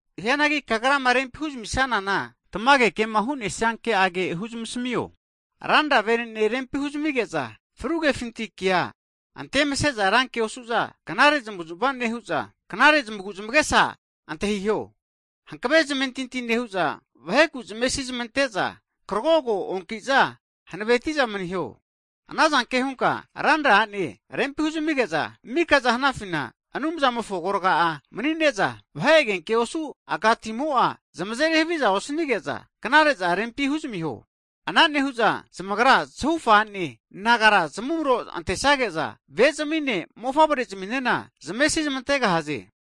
Hianagi kagrama rempi huzmisanana, tamage kema hu'nesia ke'age (doctrine) huzamasmio. Ranra vene'nea rempi huzamige'za, fru kefinti kea antemase'za ranke osu'za, knare zmavuzmava nehu'za, knare zamagu'zamagesa antahiho. Hankave zamentinti nehu'za vaheku zamesi nezmante'za, zamentintifina hanaveti'za maniho. Ana zanke hunka ranra a'ne rempi huzamige'za, mikaza hanafina Anumzamofo agorga mani'ne'za, vahe agenke osu' aka timo'a zamazeri havia osanige'za knare'za rempi huzamiho. Ana nehu'za zamagra zahufa a'ne nagara zamumro antesage'za, ve' zamine, mofavrezaminena zamesi zamantegahaze.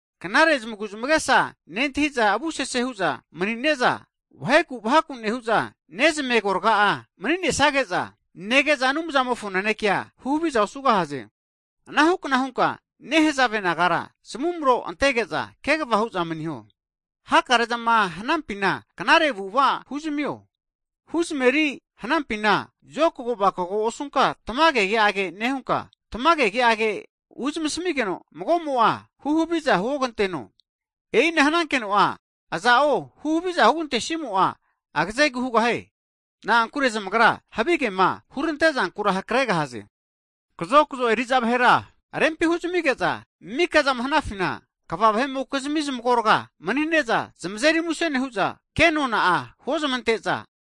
Knare zamagu'zamagesa nentahi'za avusese hu'za mani'ne'za, vaheku vahaku nehu'za, nezamave agorga'a mani'nesage'za nege'za Anumzamofo nanekea huhaviza osugahaze. Anahu kna hunka nehazave nagara zamumro antege'za, kegava hu'za maniho. Hakare'zama hanampina knare avu'ava huzamio. Huzameri hanampina zokago vakago osunka tamage ke'age nehunka, tamage ke'age huzamasmigeno mago'mo'a huhaviza huoganteno. E'ina hanankeno aza'o huhaviza hugantesimo'a agzegu hugahie. Na'ankure zamagra havigema hurante zankura hakregahaze. Hagi kazokzo eri'za vahera rempi huzamige'za mika'zama hanafina kva vahe'mokizmi zamagorga mani'ne'za zamazeri muse nehu'za, ke nona'a huozmante'za,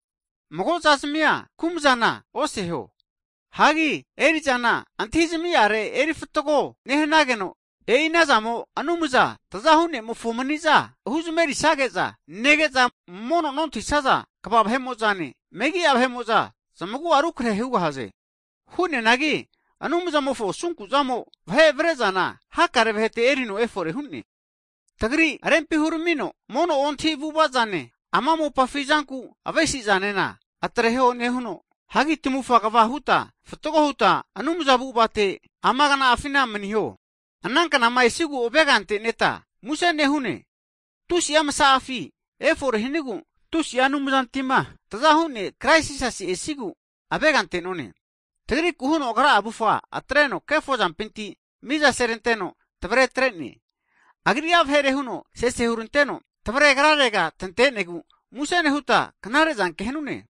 mago'zazamia kumzafa oseho. Hagi eri'zana tamage kazigati erifatgo nehanageno, e'i anazamo Anumza tzahu ne'mofo mani'za huzamerisage'za nege'za, mono nontahisaza kva vahe'mo'zane, megi'a vahe'mo'za zamagu'a rukrahe hugahaze. Na'ankure Anumzamofo asunku zamo vahe avare'zana hakare vahete erino efore hu'ne. Tagri rempi huramino mono ontahi avu'ava'zane, ama mopafi zanku avesi'zanena atreho nehuno, hagi tamufa kva huta, fatgo huta Anumzamofo (godly) avu'avate ama kna'afina maniho. Hagi ana knama esigu avega anteneta muse nehune, tusi'a masa'afi efore hanigu, Ra Anumzantima, Tazahu ne' Krais Jisasi esigu avega ante'none. Tagriku huno Agra'a avufga atreno kefo'zampinti miza seranteno tvare atre'ne, Agri'a vahere huno sese huranteno, tvare Agrarega tante'negu, muse nehuta knare zanke hanune.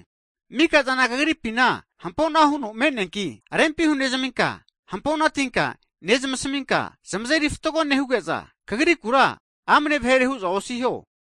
Mika'zana kagripi hampo'na huno me'neanki rempi hunezminka, hampo'na tinka nezmasaminka, zamazeri fatgo nehuge'za, kagrikura amne vahere hu'za osiho.